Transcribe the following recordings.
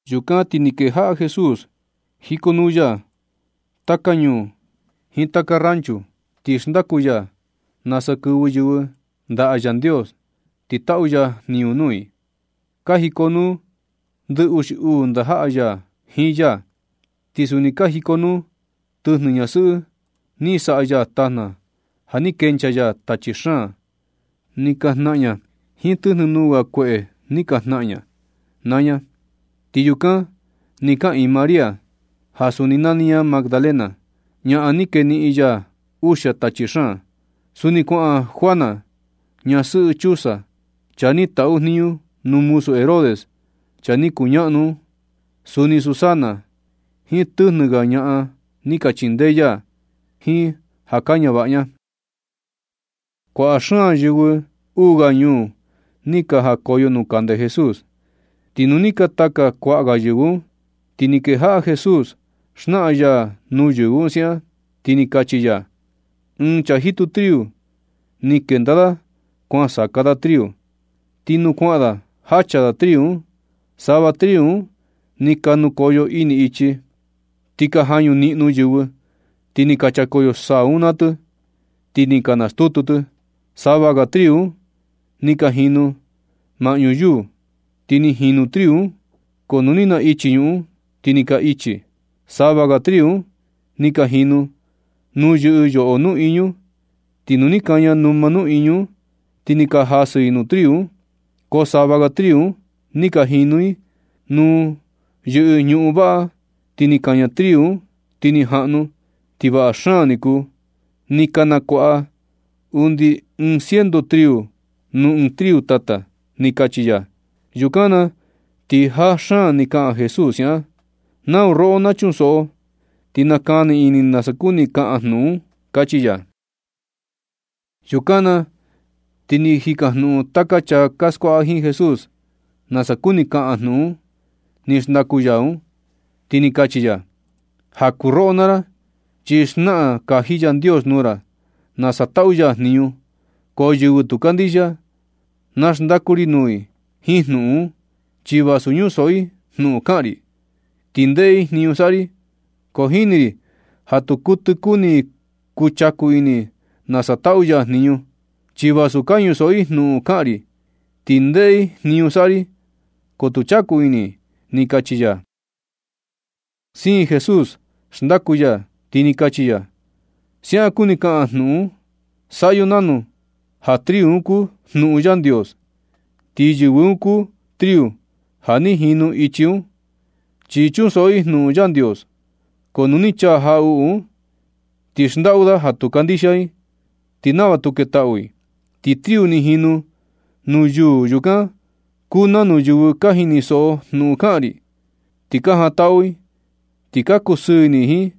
Yukan, ti ni kejaꞌa Jesús jikonuu ya taka ñuu jiin taka rancho, ti xndaku ya nasa kɨvɨ yɨvɨ ndaꞌa Yandios ti taꞌu ya jniñu nuu i. Ka jikonuu ndɨ uxi uu ndajaꞌa ya jiin ya. Ti suni ka jikonuu tɨjnɨ ñasɨꞌɨ ni saꞌa ya tajna ja ni kenchaa ya tachi xaan ni ka jnaꞌan ña jiin tɨjnɨ nuu ga kueꞌe ni ka jnaꞌan ña naa ña. Ti yukan ni kaꞌiin María, ja suni nani ña Magdalena, ñaꞌan ni keniꞌin ya uxia tachi xaan. Suni kuaꞌan Juana ñasɨꞌɨ Chuza, chaa ni taꞌu jniñu nuu muzu Herodes chaa ni kuñaꞌnu un. Suni Susana jiin tɨjnɨ ga ñaꞌan ni ka chindee ya jiin ja ka ñavaꞌa ña. Kuaꞌa xaan yɨvɨ uu ga ñuu ni ka jakoyo nuu kande Jesús, ti nu ni ka taka kuaꞌa ga yɨvɨ un, ti ni kejaꞌa Jesús xnaꞌan ya nuu yɨvɨ un siaꞌan, ti ni kachi ya: ―Ɨɨn chaa jitu triu ni kenda da kuan saka da triu. Ti nuu kuaꞌan da jacha da triu un, sava triu un ni ka nukoyo ini ichi, ni ka jañu niꞌnu yɨvɨ, ti ni ka chakoyo saa un naa tɨ, ti ni ka nastutu tɨ. Sava ga triu un ni ka jinu maꞌñu yuu, ti ni jinu triu un, ko nu ni naꞌichi ñuꞌun, ti ni ka ichi. Sava ga triu un ni ka jinu nuu yɨꞌɨ yoꞌo nuꞌiñu. Ti nu ni kaña numa nuꞌiñu un, ti ni ka jasɨ i nuu triu un. Ko sava ga triu un ni ka jinu i nuu yɨꞌɨ ñuꞌun vaꞌa, ti ni kaña triu un ti ni jaꞌnu, ti vaꞌa xaan ni kuu. Ni ka nakuaꞌa undi ɨɨn ciento triu nuu ɨɨn triu tata ―ni kachi ya. Yukan na ti jaa xaan ni kaꞌan Jesús siaꞌan: ―Nau roꞌo na chunsoꞌo, ti nakani ini nasa kuni kaꞌan jnuꞌun un ―kachi ya. Yukan na ti ni ka jikajnuꞌun taka chaa ja skuaꞌa jiin Jesús nasa kuni kaꞌan jnuꞌun ni xndaku ya un, ti ni kachi ya: ―Ja kuu roꞌo naa ra chi xnaꞌan kaji Yandios nuu ra nasa taꞌu ya jniñu, ko yɨvɨ tu kandixia, na xndaku ri nuu i jiin jnuꞌun un. Chi vasu ñusoꞌo i jnuꞌun kaꞌan ri, ti ndeꞌe i jniñu saꞌa ri, ko jini ri ja tu kuɨtɨ kuni i chaku ini nasa taꞌu ya jniñu. Chi vasu ka ñusoꞌo i jnuꞌun kaꞌan ri, ti ndeꞌe i jniñu saꞌa ri, ko tu chaku ini i ―ni kachi ya. Siin Jesús xndaku ya, ti ni kachi ya: ―Siaꞌan kuni kaꞌan jnuꞌun un. Saꞌa yo nanu ja triu un kuu jnuꞌun Yandios. Ti yɨvɨ un kuu triu ja ni jinu ichi un, chi chunsoꞌo i jnuꞌun Yandios, ko nu ni chaa jaꞌuꞌu un, ti xndaꞌu da ja tu kandixia i, ti nava tu ketaꞌu i. Ti triu ni jinu nuu yuu yukan kuu nanu yɨvɨ ni ka jinisoꞌo jnuꞌun kaꞌan ri, ni ka jantaꞌu i, ti ka kusɨɨ ini i jiin.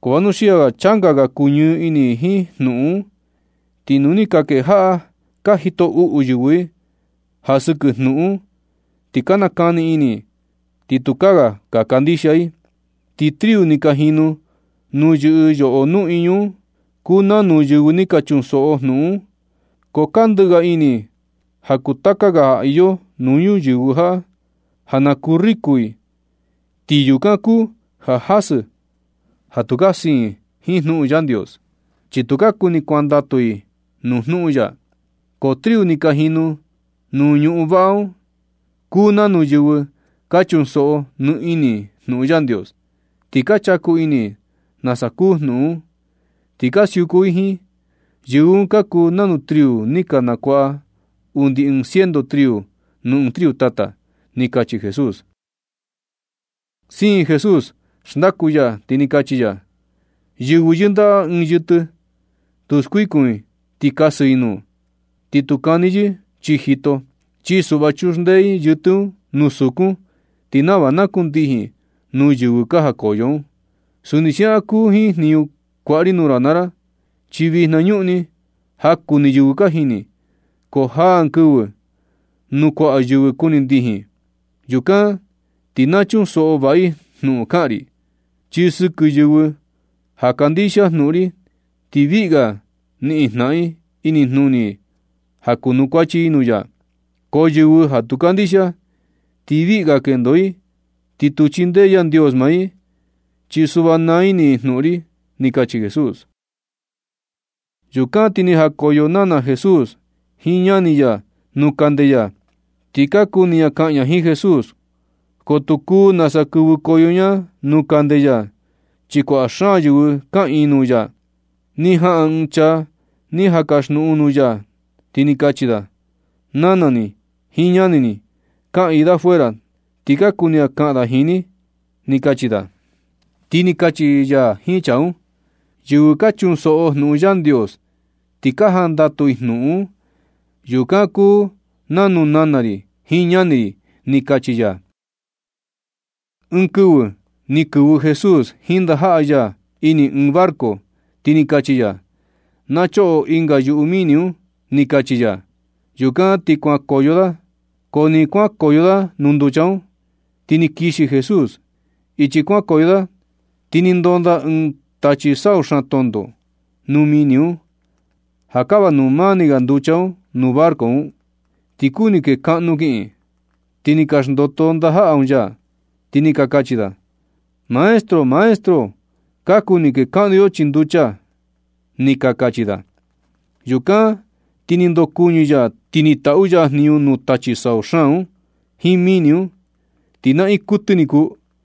Ko vanuxia ja changa ga kuñɨɨ ini i jiin jnuꞌun un, ti nu ni ka kejaꞌa ka jito uꞌu yɨvɨ i ja sɨkɨ jnuꞌun un, ti ka nakani ini i, ti tukaa ga ka kandixia i. Ti triu ni ka jinu nuu yɨꞌɨ yoꞌo nuꞌiñu kuu nanu yɨvɨ ni ka chunsoꞌo jnuꞌun un, ko ka ndɨꞌɨ ga ini i ja kuu taka ga ja iyo nuu ñuyɨvɨ jaꞌa, ja na kuu riku i. Ti yukan kuu ja jasɨ ja tu ka siin jiin jnuꞌun Yandios, chi tukaa kuni kuandatu i nuu jnuꞌun ya. Ko triu ni ka jinu nuu ñuꞌun vaꞌa un kuu nanu yɨvɨ ka chunsoꞌo nɨɨ ini i jnuꞌun Yandios, ti ka chaku ini i nasa kuu jnuꞌun un, ti ka siuku i jiin. Yɨvɨ un ka kuu nanu triu ni ka nakuaꞌa undi ɨɨn ciento triu nuu ɨɨn triu tata ―ni kachi Jesús. Siin Jesús xndaku ya, ti ni kachi ya. ―Yɨvɨ yɨndaꞌa ɨɨn yɨtɨ, tu skuikun i ti kasɨ i nuu, ni tu kani yɨ chii jito. Chi suꞌva chuxndee i yɨtɨ un nuu sukun, ti nava na kundijin nuu yɨvɨ ka jakoyo un. Suni siaꞌan kuu jiin jniñu kuaꞌa ri nuu ra naa ra, chi vijna ñuꞌni jaku ni yɨvɨ ka jini, ko jaa ɨɨn kɨvɨ nu kuaꞌa yɨvɨ kuni ndijin. Yukan ti na chunsoꞌo vaꞌa i jnuꞌun kaꞌan ri, chi sɨkɨ yɨvɨ ja kandixia jnuꞌun ri, ti viꞌi ga niꞌin jnaꞌan i inijnuni i ja kunukuachi i nuu ya. Ko yɨvɨ ja tu kandixia, ti viꞌi ga kendo i, ti tu chindee Yandios maa i. Chi suꞌva naa ini i jnuꞌun ri ―ni kachi Jesús. Yukan ti ni jakoyo nana Jesús jiin ñani ya nuu kande ya, ti ka kuni ña kaꞌan ña jiin Jesús, ko tu kuu nasa kɨvɨkoyo ña nuu kande ya, chi kuaꞌa xaan yɨvɨ kaꞌiin nuu ya. Ni jaꞌan ɨɨn chaa ni jan kasjnuꞌun nuu ya, ti kachi da: ―Nana ni jiin ñani ni kaꞌiin da fuera, ti ka kuni kaꞌan da jiin ni ―ni kachi da. Ti ni kachi ya jiin chaa un: ―Yɨvɨ ka chunsoꞌo jnuꞌun Yandios ti ka jandatu i jnuꞌun un, yukan kuu nanu nana ri jiin ñani ri ―ni kachi ya. Ɨɨn kɨvɨ ni kɨvɨ Jesús jiin ndajaꞌa ya ini ɨɨn barco, ti ni kachi ya: ―Na choꞌo ɨnga yuꞌu mini un ―ni kachi ya. Yukan ti kuankoyo da. Ko nɨ kuankoyo da nuu nducha un, ti ni kixi Jesús. Ichi kuankoyo da ti ni ndonda ɨɨn tachi sau xaan tonto nuu mini un ja kava nuu mani ga nducha un nuu barco un, ti kuni kee kaꞌnu kiꞌin. Ti ni ka xndoto ndajaꞌa un ya, ti ni ka kachi da: ―¡Maestro! ¡Maestro! Ka kuni kekaꞌnu yo chii nducha ―ni ka kachi da. Yukan ti ni ndokuɨñɨ ya ti ni taꞌu ya jniñu nuu tachi sau xaan un jiin mini un, ti naꞌiin kuɨtɨ ni kuu.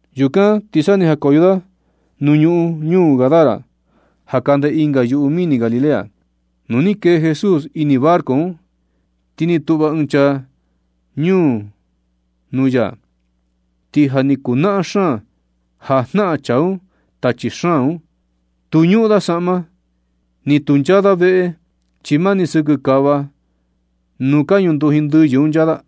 Yukan sa ni ka jakoyo da nuu ñuꞌun ñuu Gadara ja kande ɨnga yuꞌu mini Galilea. Nu ni kee Jesús ini barco un, ti ni tuꞌva ɨɨn chaa ñuu un nuu ya. Ti ja ni kuu naꞌan xaan ja jnaꞌan chaa un tachi xaan un. Tu ñuꞌun da saꞌma, ni tu nchaa da veꞌe, chi mani sɨkɨ kava nuu ka ñunduji ndɨyɨ un nchaa da.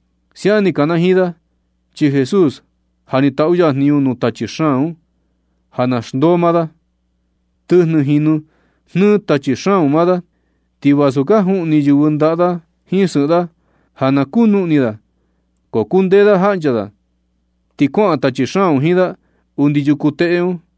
Siaꞌan ni kanajiin da, chi Jesús ja ni taꞌu ya jniñu nuu tachi xaan ja na xndoo maa da. Tɨjnɨ jinu jnɨɨ tachi xaan un maa da, ti vasu ka juꞌni yɨvɨ ndaꞌa da jiin sɨꞌɨn da ja na kunuꞌni da, ko kundee da jaꞌncha da, ti kuaꞌan tachi xaan un jiin da undi yuku teꞌe un.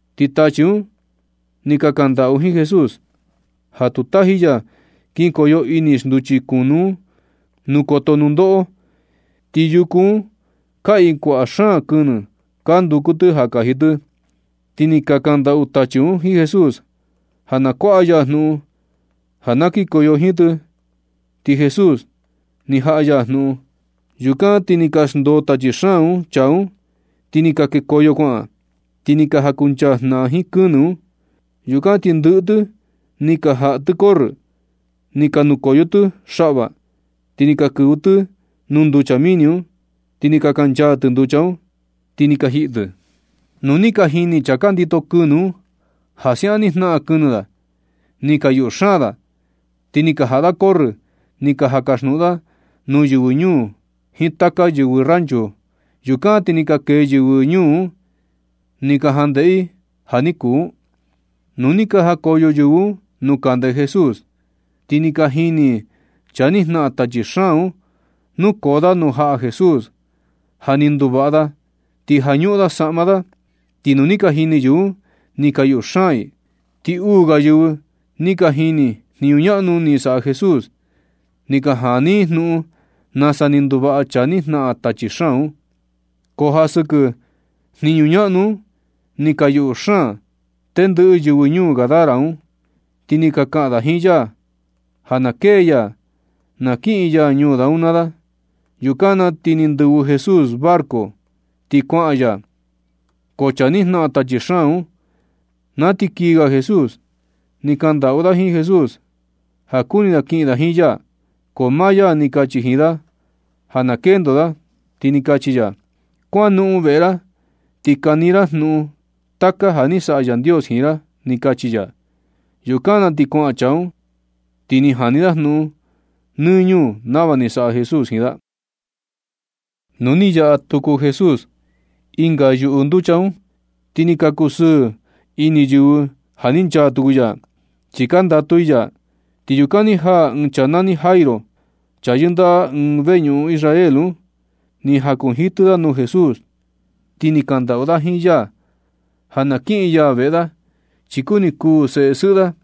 Ti tachi un ni ka kandaꞌu jiin Jesús ja tu taji ya kinkoyo ini xnduchi kunu un nuu koto nundoꞌo. Ti yuku un kaꞌiin kuaꞌa xaan kɨnɨ ka nduku tɨ ja kaji tɨ, ti ni ka kandaꞌu tachi un jiin Jesús ja na kuaꞌa ya jnuꞌun ja na kinkoyo jiin tɨ, ti Jesús ni jaꞌa ya jnuꞌun. Yukan ti ni ka xndoo tachi xaan un chaa un, ti ni ka kekoyo kuaꞌan, ti ni ka jankuncha jnaꞌan jiin kɨnɨ un. Yukan ti ndɨꞌɨ tɨ ni ka jaꞌa tɨ corrɨ, ni ka nukoyo tɨ xaꞌva, ti ni ka kɨvɨ tɨ nuu nducha mini un, ti ni ka kanchaa tɨ nducha un, ti ni ka jiꞌi tɨ. Nu ni ka jini chaa ka ndito kɨnɨ un ja siaꞌan ni ka jnaꞌan kɨnɨ da, ni ka yuꞌu xaan da. Ti ni ka jaꞌa da corrɨ ni ka jan kasjnuꞌun da nuu yɨvɨ ñuu jiin taka yɨvɨ rancho. Yukan ti ni ka kee yɨvɨ ñuu un ni ka jandeꞌe i ja ni kuu un. Nu ni ka jakoyo yɨvɨ un nuu kande Jesús, ti ni ka jini i chaa ni jnaꞌan tachi xaan un nukoo da nuu jaꞌa Jesús, ja ni nduvaꞌa da ti ja ñuꞌun da saꞌma da. Ti nu ni ka jini yɨvɨ un ni ka yuꞌu xaan i. Ti uu ga yɨvɨ ni ka jini i jniñu ñaꞌnu ni saꞌa Jesús ni ka jani i jnuꞌun nasa ni nduvaꞌa chaa ni jnaꞌan tachi xaan un. Ko ja sɨkɨ jniñu ñaꞌnu un ni ka yuꞌu xaan tendɨꞌɨ yɨvɨ ñuu Gadara un, ti ni ka kaꞌan da jiin ya ja na kee ya na kiꞌin ya ñuu da un naa da. Yukan na ti ni ndɨvɨ Jesús barco ti kuaꞌan ya. Ko chaa ni jnaꞌan tachi xaan un, na ti kiꞌin ga Jesús ni kaꞌan ndaꞌu da jiin Jesús ja kuni da kiꞌin da jiin ya. Ko maa ya ni kachi jiin da ja na kendo da, ti ni kachi ya: ―Kuanoꞌon veꞌe ra, ti kani ra jnuꞌun taka ja ni saꞌa Yandios jiin ra ―ni kachi ya. Yukan na ti kuaꞌan chaa un, ti ni jani da jnuꞌun nɨ ñuu nava ni saꞌa Jesús jiin da. Nu ni nayaꞌa tuku Jesús ɨnga yuꞌu nducha un, ti ni ka kusɨɨ ini yɨvɨ ja ni nchaa tuku ya, chi ka ndatu i ya. Ti yukan ni jaa ɨɨn chaa nani Jairo, chaa yɨndaꞌa ɨɨn veñuꞌun Israel un. Ni jakunjitɨ da nuu jaꞌa Jesús, ti ni kandaꞌu da jiin ya ja na kiꞌin ya veꞌe da, chi kuni kuu seꞌe sɨꞌɨ da,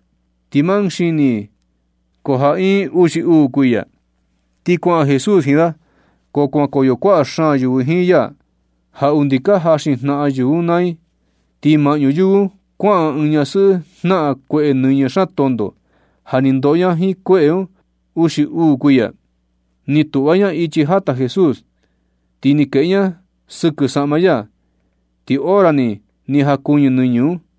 ti ma ɨɨn xini i, ko ja iin i uxi uu kuiya. Ti kuaꞌan Jesús jiin da. Ko kuankoyo kuaꞌa xaan yɨvɨ jiin ya ja undi ka jaxin jnaꞌan yɨvɨ un naa i. Ti maꞌñu yɨvɨ un kuaꞌan ɨɨn ñasɨꞌɨ jnaꞌan kueꞌe nɨñɨ xaan tonto ja ni ndoꞌo ña jiin kueꞌe un uxi uu kuiya. Ni tuꞌva ña ichi jata Jesús, ti ni keꞌe ña sɨkɨ saꞌma ya. Ti hora ni ni jakuɨñɨ nɨñɨ un.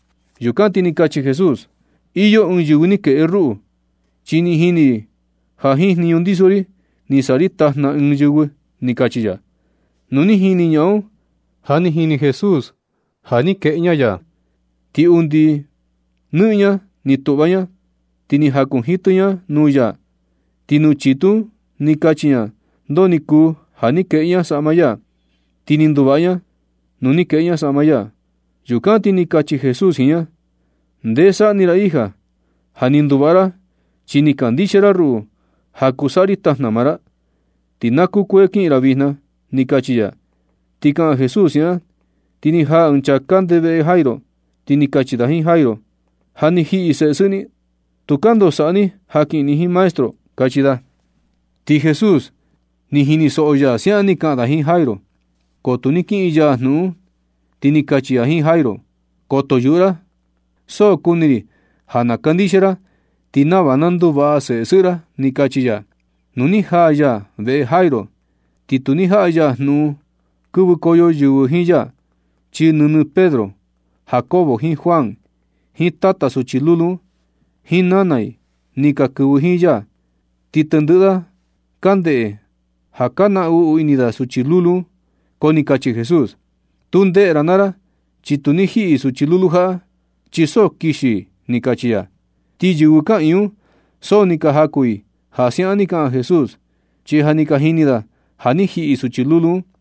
Yukan ti ni kachi Jesús: ―Iyo ɨɨn yɨvɨ ni keꞌe ruꞌu, chi ni jini ri ja jiin jniñu ndiso ri ni saꞌa ri tajna ɨɨn yɨvɨ ―ni kachi ya. Nu ni jini ñaꞌan un ja ni jini Jesús ja ni keꞌe ña ya, ti undi nɨꞌɨn ña ni tuꞌva ña, ti ni jakunjitɨ ña nuu ya. Ti nuu chitu un ni kachi ña ndoo ni kuu ja ni keꞌe ña saꞌma ya, ti ni nduvaꞌa ña nuu ni kueꞌe ña saꞌma ya. Yukan ti ni kachi Jesús jiin ña: ―Ndee saꞌni ra hija. Ja ni nduvaꞌa ra chi ni kandixia ra ruꞌu ja kuu saꞌa ri tajna maa ra. Ti na kukuee kiꞌin ra vijna ―ni kachi ya. Ti kaꞌan Jesús siaꞌan, ti ni jaa ɨɨn chaa kande veꞌe Jairo, ti ni kachi da jiin Jairo: ―Ja ni jiꞌi seꞌe sɨꞌɨ ni. Tukaa ndoo saꞌa ni ja kiꞌin ni jiin maestro ―kachi da. Ti Jesús ni jinisoꞌo ya ja siaꞌan ni ka kaꞌan da jiin Jairo. Ko tu ni kiꞌin ya jnuꞌun, ti ni kachi ya jiin Jairo: ―Koto yuꞌu ra, so kuni ri ja na kandixia ra ti nava na nduvaꞌa seꞌe sɨꞌɨ ra ―ni kachi ya. Nu ni jaa ya veꞌe Jairo, ti tu ni jaꞌa ya jnuꞌun kɨvɨkoyo yɨvɨ jiin ya, chi nɨnɨ Pedro, Jacobo jiin Juan, jiin tata suchi lulu un, jiin nana i ni ka kɨvɨ jiin ya. Ti tendɨꞌɨ da ka ndeꞌe ja ka naꞌnu ini da suchi lulu un, ko ni kachi Jesús: ―Tu ndeꞌe ra naa ra, chi tu ni jiꞌi suchi lulu jaꞌa, chi so kixi i ―ni kachi ya. Ti yɨvɨ kaꞌiin un so ni ka jaku i ja siaꞌan ni kaꞌan Jesús, chi ja ni ka jini da ja ni jiꞌi suchi lulu un.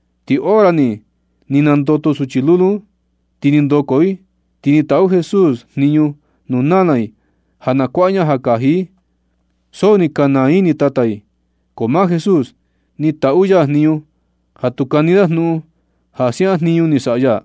Ti hora ni, ni nandoto suchi lulu un, ti ni ndoko i. Ti ni taꞌu Jesús jniñu nuu nana i ja na kuaꞌa ña ja kaji i. So ni ka naa ini tata i. Ko maa Jesús ni taꞌu ya jniñu ja tu kani da jnuꞌun ja siaꞌan jniñu ni saꞌa ya.